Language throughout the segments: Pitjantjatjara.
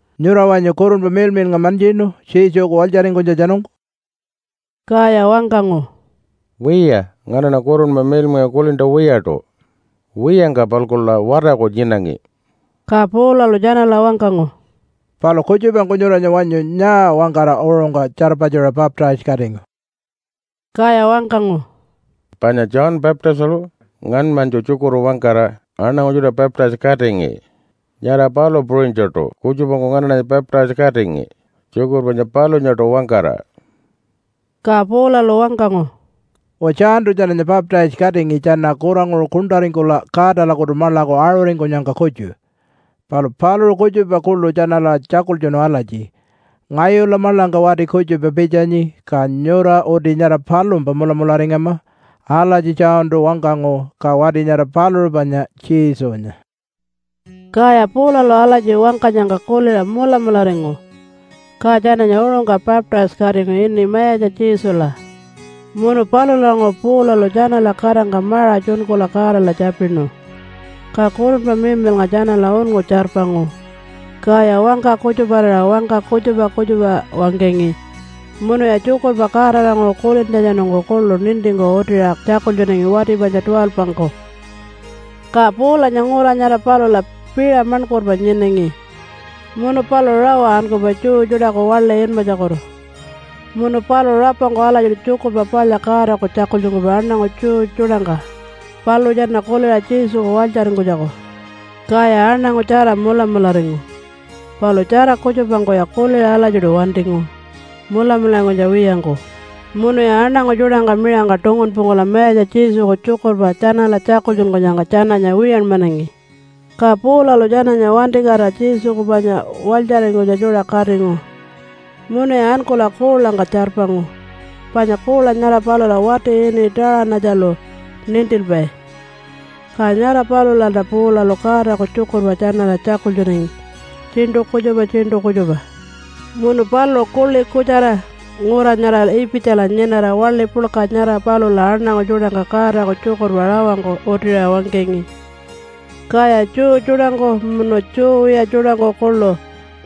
“Nyura wanyu Kurunpa Miḻmiḻnga mantjinu Jesuku walytjaringkunytjatjanungku?” Kaya wangkangu, “Wiya, nganaṉa Kurunpa Miḻmiḻnga kulintja wiyaṯu. Wiyangka-palkula watarku nyinangi.” Ka Paulalu tjanala wangkangu, “Palu kutjupangku nyuranya wanyu nyaa wangkara uṟungka tjarpatjuṟa baptise-katingu?” Kaya wangkangu, “Panya John Baptistalu ngaṉmanytju tjukurpa wangkara aṉangu tjuṯa baptise-katingi, nyara palu puṟunytjuṯu kutjupangku nganaṉanya baptise-katingi tjukurpa panya palunyaṯu wangkara.” Ka Paulalu wangkangu, “Uwa, Johntu tjananya baptise-katingi tjana kuranguṟu kuṉṯaringkula Godalakutu maḻaku aṟuringkunyangka kutju. Palu paluṟu kutjupa kuḻu tjanala tjakultjunu alatji, ‘Ngayula maḻangka wati kutjupa pitjanyi, ka nyura uti nyara palumpa mulamularingama.’ Alatji Johntu wangkangu. Ka wati nyara paluṟu panya Jesunya.” Kaya Paulalu alatji wangkanyangka kuliṟa mulamularingu, ka tjananya uṟungka baptise-katingu ini Mayatja Jesula. Munu palulanguṟu Paulalu tjanala katangka maṟa tjunkula Godala tjapinu, ka Kurunpa Miḻmiḻnga tjanala unngu tjarpangu, kaya wangka kutjuparira wangka kutjupa kutjupa wangkangi munuya tjukurpa Godalanguṟu kulintjatjanungku kuḻu nintingku utiṟa tjakultjunangi wati panya 12-ngku. Ka Paulanya ngura nyara palula piṟa maṉkurpa nyinangi, munu paluṟu rawa ankupai Jew tjuṯaku waḻi inmatjakutu, munu paluṟu rapangku alatjiṯu Tjukurpa Palya Godaku tjakultjunkupai aṉangu Jew tjuṯangka, paluṟu tjana kuliṟa Jesuku walytjaringkunytjaku. Kaya aṉangu tjara mulamularingu, palu tjara kutjupangkuya kuliṟa alatjiṯu wantingu mulamularingkunytja wiyangku munuya aṉangu tjuṯangka miṟangka tungunpungkula Mayatja Jesuku tjukurpa tjanala tjakultjunkunyangka tjananya wiyanmanangi. Ka Paulalu tjananya wantikatira Jesuku panya walytjaringkunytja tjuṯa katingu munuya ankula kuulangka tjarpangu panya kuula nyara palula wati ini Taṟanatjalu nintilpai. Ka nyara palulalta Paulalu Godaku tjukurpa tjanala tjakultjunangi tjiṉṯu kutjupa tjiṉṯu kutjupa. Munu paluṟu kuḻi kutjara ngura nyara Ipitjala nyinara waḻi puḻka nyara palula aṉangu tjuṯangka Godaku tjukurpa rawangku utiṟa wangkangi. Kaya Jew tjuṯangku, munu Jew wiya tjuṯangku kuḻu,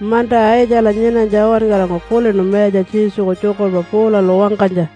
manta Aitjala nyinanytja uwankarangku kulinu Mayatja Jesuku tjukurpa Paulalu wangkanytja.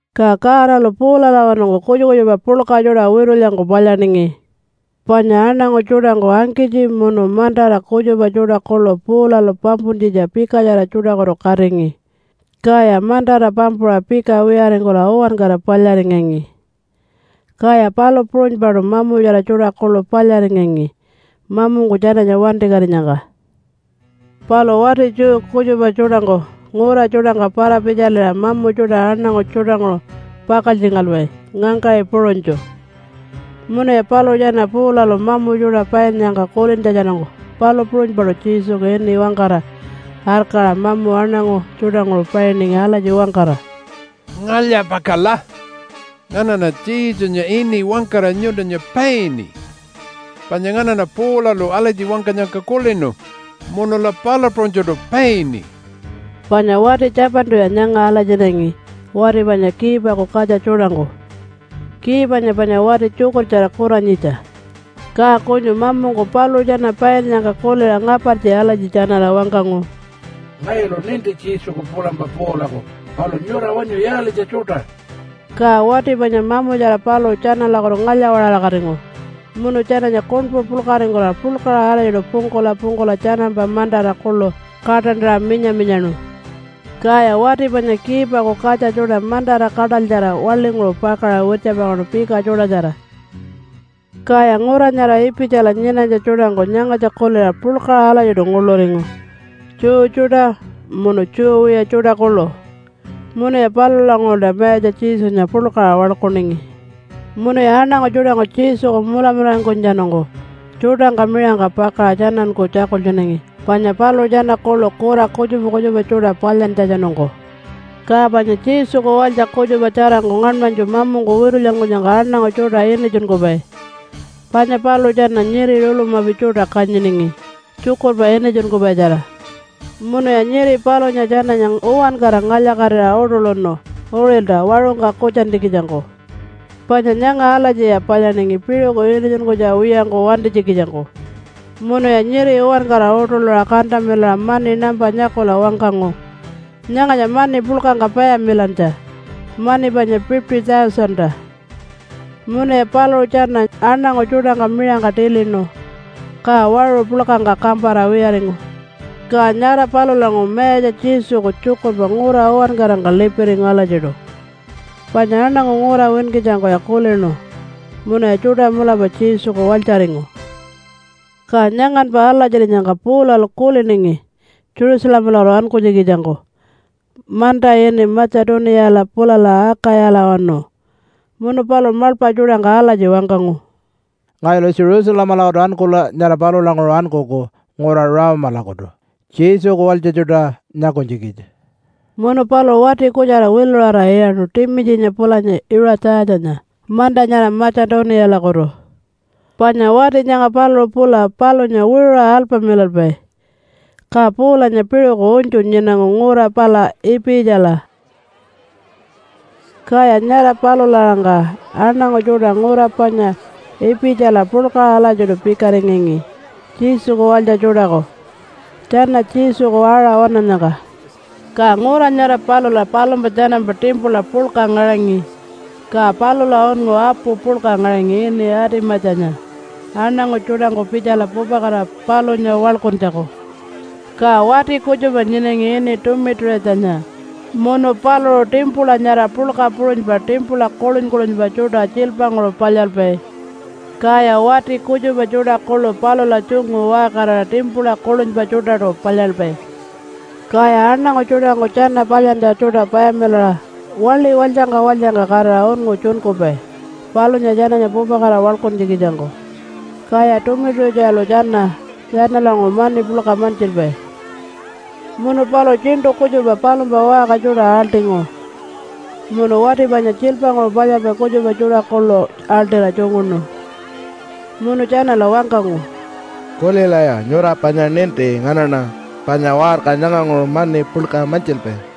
Ka Godalu Paulalawanungku kutjupa kutjupa puḻka tjuṯa witulyangku palyaningi. Panya aṉangu tjuṯangku angkitji munu mantara kutjupa tjuṯa kuḻu Paulalu pampuntjitja pikatjara tjuṯakutu katingi, kaya mantara pampuṟa pika wiyaringkula uwankara palyaringangi, kaya palu puṟunypaṯu mamutjara tjuṯa kuḻu palyaringangi mamungku tjananya wantikatinyangka. Palu wati Jew kutjupa tjuṯangku ngura tjuṯangka para-pitjaliṟa mamu tjuṯa aṉangu tjuṯanguṟu pakaltjingalpai ngangkaṟi puṟunytju. Munuya paluṟu tjana Paulalu mamu tjuṯa painnyangka kulintjatjanungku palu puṟunypaṯu Jesuku ini wangkara arkaṟa mamu aṉangu tjuṯanguṟu painingi alatji wangkara, “Ngalya-pakala! Nganaṉa Jesunya ini wangkara nyuntunya paini panya nganaṉa Paulalu alatji wangkanyangka kulinu munula palu puṟunytjuṯu paini.” Panya wati 7-tuya nyanga alatjinganingi wati panya Kiipaku katja tjuṯangku. Kiipanya panya wati tjukurtjara kuranyitja. Ka kunyu mamungku paluṟu tjana painnyangka kuliṟa ngapartji alatji tjanala wangkangu, “Ngayulu ninti Jesuku pulampa Paulaku, palu nyura wanyu yaalitja tjuṯa?” Ka wati panya mamutjara paluṟu tjanalakutu ngalya-waṟarakatingu munu tjananya kuṉpu puḻkaringkula puḻkaṟa alatjiṯu pungkula pungkula tjanampa mantara kuḻu kaṯantaṟa minya-minyaṉu, kaya wati panya Kiipaku katja tjuṯa mantara kaṯalytjara waḻinguṟu pakaṟa wirtjapakaṉu pika tjuṯatjara. Kaya ngura nyara Ipitjala nyinanytja tjuṯangku nyangatja kuliṟa puḻkaṟa alatjiṯu nguḻuringu Jew tjuṯa munu Jew wiya tjuṯa kuḻu. Munuya palulanguṟulta Mayatja Jesunya puḻkaṟa waḻkuningi. Munuya aṉangu tjuṯangku Jesuku mulamularingkunytjatjanungku tjuṯangka miṟangka pakaṟa tjananku tjakultjunangi panya paluṟu tjana kuḻu kura kutjupa kutjupa tjuṯa palyantjatjanungku. Ka panya Jesuku walytja kutjupa tjarangku ngaṉmanytju mamungku witulyankunyangka aṉangu tjuṯa initjunkupai. Panya paluṟu tjana nyiri rulamapi tjuṯa kanyiningi tjukurpa initjunkupaitjara. Munuya nyiri palunya tjananya uwankara ngalya-katira uṯuḻuṉu uṟilta waṟungka kutjantjikitjangku. Panya nyanga alatjiya palyaningi piṟuku initjunkunytja wiyangku wantinytjikitjangku. Munuya nyiri uwankara uṯuḻuṟa kantamilaṟa mani nampa nyakula wangkangu, “Nyangatja mani puḻkangka payamilantja, mani panya $50,000-ta.” Munuya paluṟu tjana aṉangu tjuṯangka miṟangka tilinu ka waṟu puḻkangka kampara wiyaringu. Ka nyara palulanguṟu Mayatja Jesuku tjukurpa ngura uwankarangka lipiringu alatjiṯu, panya aṉangu ngura winkitjangkuya kulinu munuya tjuṯa mulapa Jesuku walytjaringu. Ka nyanganpa alatjirinyangka Paulalu kuliningi Jerusalemalakutu ankunytjikitjangku manta ini Matja-tuniyala pulala Akayalawanu. Munu paluṟu maḻpa tjuṯangka alatji wangkangu, “Ngayulu Jerusalemalakutu ankula nyara palulanguṟu ankuku ngura Rome-lakutu Jesuku walytja tjuṯa nyakunytjikitja.” Munu paluṟu wati kutjara wiluṟara iyaṉu Timitjinya pulanya Iṟatjatjanya manta nyara Matja-tuniyalakutu, panya wati nyanga paluṟu pula palunya wiṟuṟa alpamilalpai. Ka Paulanya piṟuku unytju nyinangu ngura pala Ipitjala. Kaya nyara palula-aṟangka aṉangu tjuṯa ngura panya Ipitjala puḻkaṟa alatjiṯu pikaringangi Jesuku walytja tjuṯaku tjana Jesuku aṟa waṉannyangka. Ka ngura nyara palula palumpa tjanampa timpula puḻka ngaṟangi, ka palula unngu apu puḻka ngaṟangi ini Atimatjanya aṉangu tjuṯangku pitjala pupakatira palunya waḻkuntjaku. Ka wati kutjupa nyinangi ini Tumitu-ṟitjanya, munu paluṟu timpula nyara puḻka puṟunypa timpula kuḻuny-kuḻunypa tjuṯa tjiilpanguṟu palyalpai. Kaya wati kutjupa tjuṯa kuḻu palula tjungu waṟkarira timpula kuḻunypa tjuṯaṯu palyalpai. Kaya aṉangu tjuṯangku tjana palyantja tjuṯa payamilaṟa waḻi walytjangka walytjangka katira unngu tjunkupai palunya tjananya pupakatira waḻkuntjikitjangku. Kaya Tumitu-ṟitjalu tjana tjanalanguṟu mani puḻka mantjilpai. Munu paluṟu tjiṉṯu kutjupa palumpa waṟka tjuṯa aḻṯingu munu wati panya tjiilpanguṟu palyalpai kutjupa tjuṯa kuḻu aḻṯira tjunguṉu. Munu tjanala wangkangu, “Kulilaya! Nyura panya ninti nganaṉa panya waṟka nyanganguṟu mani puḻka mantjilpai.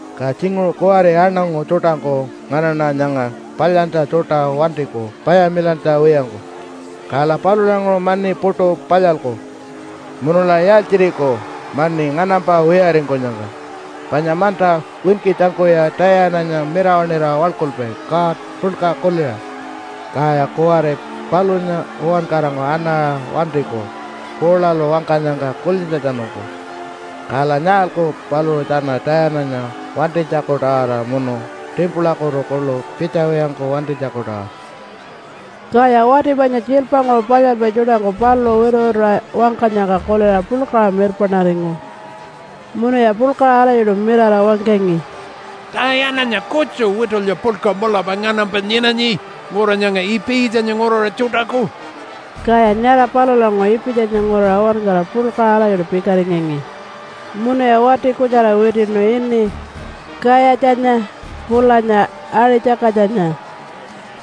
Ka tjinguṟu kuwari aṉangu tjuṯangku nganaṉa nyanga palyantja tjuṯa wantiku payamilantja wiyangku, kala palulanguṟu mani puṯu palyalku, munula yaaltjiriku mani nganampa wiyaringkunyangka? Panya manta winkitjangkuya Tayananya mirawaṉira waḻkulpai god puḻka kuliṟa. Kaya kuwari palunya uwankarangku anaṟa wantiku Paulalu wangkanyangka kulintjatjanungku. Kala nyaalku paluṟu tjana Tayananya wantinytjaku-tawara munu timpulakutu kuḻu pitjawiyangku wantinytjaku-tawara?” Kaya wati panya tjiilpanguṟu palyalpai tjuṯangku paluṟu wituwituṟa wangkanyangka kuliṟa puḻkaṟa mirpaṉaringu munuya puḻkaṟa alatjiṯu mirara wangkangi, “Tayananya kutju witulya puḻka mulapa nganampa nyinanyi ngura nyanga Ipitjanya nguraṟa tjuṯaku!” Kaya nyara palulanguṟu Ipitjanya nguraṟa uwankara puḻkaṟa alatjiṯu pikaringangi munuya wati kutjara witiṉu ini Kayatjanya pulanya Aṟi-tjakatjanya,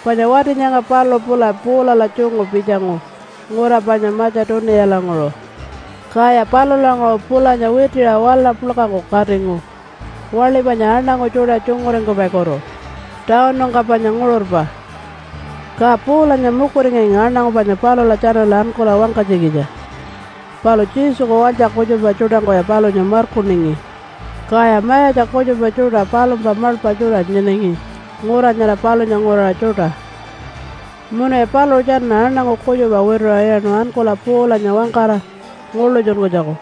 panya wati nyanga paluṟu pula Paulala tjungu pitjangu ngura panya Matja-tuniyalanguṟu. Kaya palulanguṟu pulanya witiṟa wala puḻkangku katingu waḻi panya aṉangu tjuṯa tjunguringkupaikutu tawunungka panya nguṟurpa. Ka Paulanya mukuringangi aṉangu panya palula tjanala ankula wangkanytjikitja, palu Jesuku walytja kutjupa tjuṯangkuya palunya markuningi. Kaya mayatja kutjupa tjuṯa palumpa maḻpa tjuṯa nyinangi ngura nyara palunya nguraṟa tjuṯa munuya paluṟu tjana aṉangu kutjupa wituṟa iyaṉu ankula Paulanya wangkara nguḻutjunkunytjaku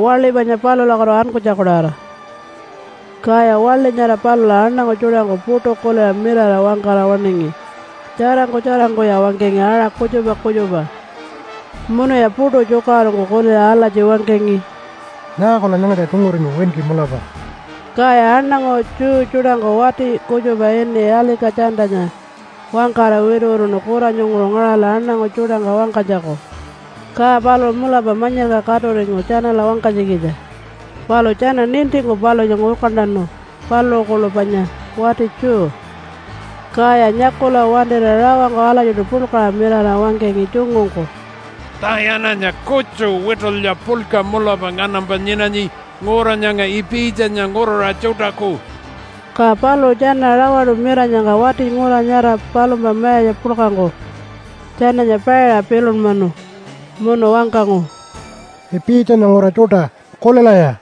waḻi panya palulakutu ankunytjaku-tawara. Kaya waḻi nyara palula aṉangu tjuṯangku puṯu kuliṟa mirara wangkara waṉingi. Tjarangku tjarangkuya wangkangi aṟa kutjupa kutjupa, munuya puṯu tjukaṟurungku kuliṟa alatji wangkangi, “Nyaakula nyangatja tjunguringu winki mulapa?” Kaya aṉangu Jew tjuṯangku wati kutjupa ini Alika-tjantanya wangkara wituwituṉu kuranyunguṟu ngaṟala aṉangu tjuṯangka wangkanytjaku. Ka paluṟu mulapa manyirka katuringu tjanala wangkanytjikitja. Palu tjana nintingku palunya ngurkantanu paluṟu kuḻu panya wati Jew. Kaya nyakula wantira rawangku alatjiṯu puḻkaṟa mirara wangkangi tjungungku, “Tayananya kutju witulya puḻka mulapa nganampa nyinanyi ngura nyanga Ipitjanya nguraṟa tjuṯaku!” Ka paluṟu tjana rawaṯu miranyangka wati ngura nyara palumpa mayatja puḻkangku tjananya paiṟa pilunmanu munu wangkangu, “Ipitjanya nguraṟa tjuṯa kulilaya!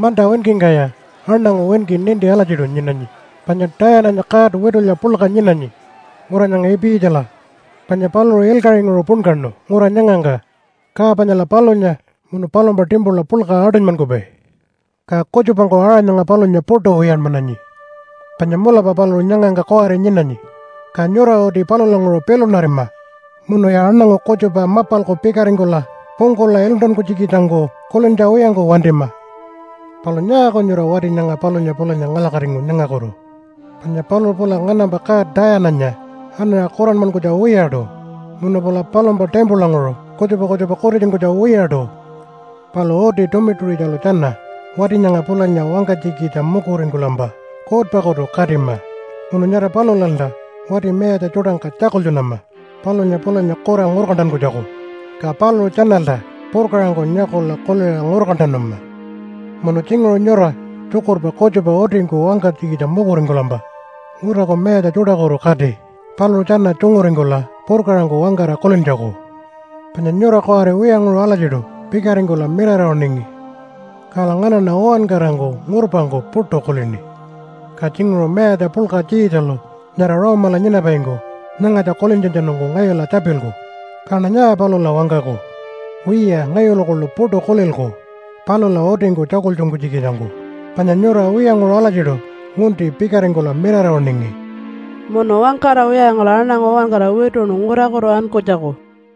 Manta winkingkaya aṉangu winki ninti alatjiṯu nyinanyi panya Tayananya god witulya puḻka nyinanyi ngura nyanga Ipitjala. Panya paluṟu ilkaṟinguṟu punkaṉu ngura nyangangka ka panyala palunya munu palumpa timpula puḻka aṯunymankupai. Ka kutjupangku aṟa nyanga palunya puṯu wiyanmananyi. Panya mulapa paluṟu nyangangka kuwari nyinanyi. Ka nyura uti palulanguṟu pilunarima munuya aṉangu kutjupa mapalku pikaringkula pungkula iluntankunytjikitjangku kulintja wiyangku wantima. Palu nyaaku nyura wati nyanga palunya pulanya ngalya-katingu nyangakutu, panya paluṟu pula nganampa god Tayananya anaṟa kuranmankunytja wiyaṯu, munu pula palumpa timpulanguṟu kutjupa kutjupa kutitjunkunytja wiyaṯu. Palu uti Tumitu-ṟitjalu tjana wati nyanga pulanya wangkanytjikitja mukuringkulampa kuutpakutu katima, munu nyara palulalta wati mayatja tjuṯangka tjakultjunama palunya pulanya kura ngurkantankunytjaku, ka paluṟu tjanalta purkaṟangku nyakula kuliṟa ngurkantanama. Munu tjinguṟu nyura tjukurpa kutjupa utingku wangkanytjikitja mukuringkulampa nguraku mayatja tjuṯakutu kati paluṟu tjana tjunguringkula purkaṟangku wangkara kulintjaku. Panya nyura kuwari wiyanguṟu alatjiṯu pikaringkula mirara waṉingi. Kala nganaṉa uwankarangku ngurpangku puṯu kulini. Ka tjinguṟu mayatja puḻka Tjiitjalu nyara Rome-ala nyinapaingku nyangatja kulintjatjanungku ngayula tjapilku. Kaṉa nyaa palula wangkaku? Wiya, ngayulu kuḻu puṯu kulilku palula utingku tjakultjunkunytjikitjangku, panya nyura wiyanguṟu alatjiṯu ngunti pikaringkula mirara waṉingi.” Munu wangkara wiyaringkula aṉangu uwankara wituṉu ngurakutu ankunytjaku.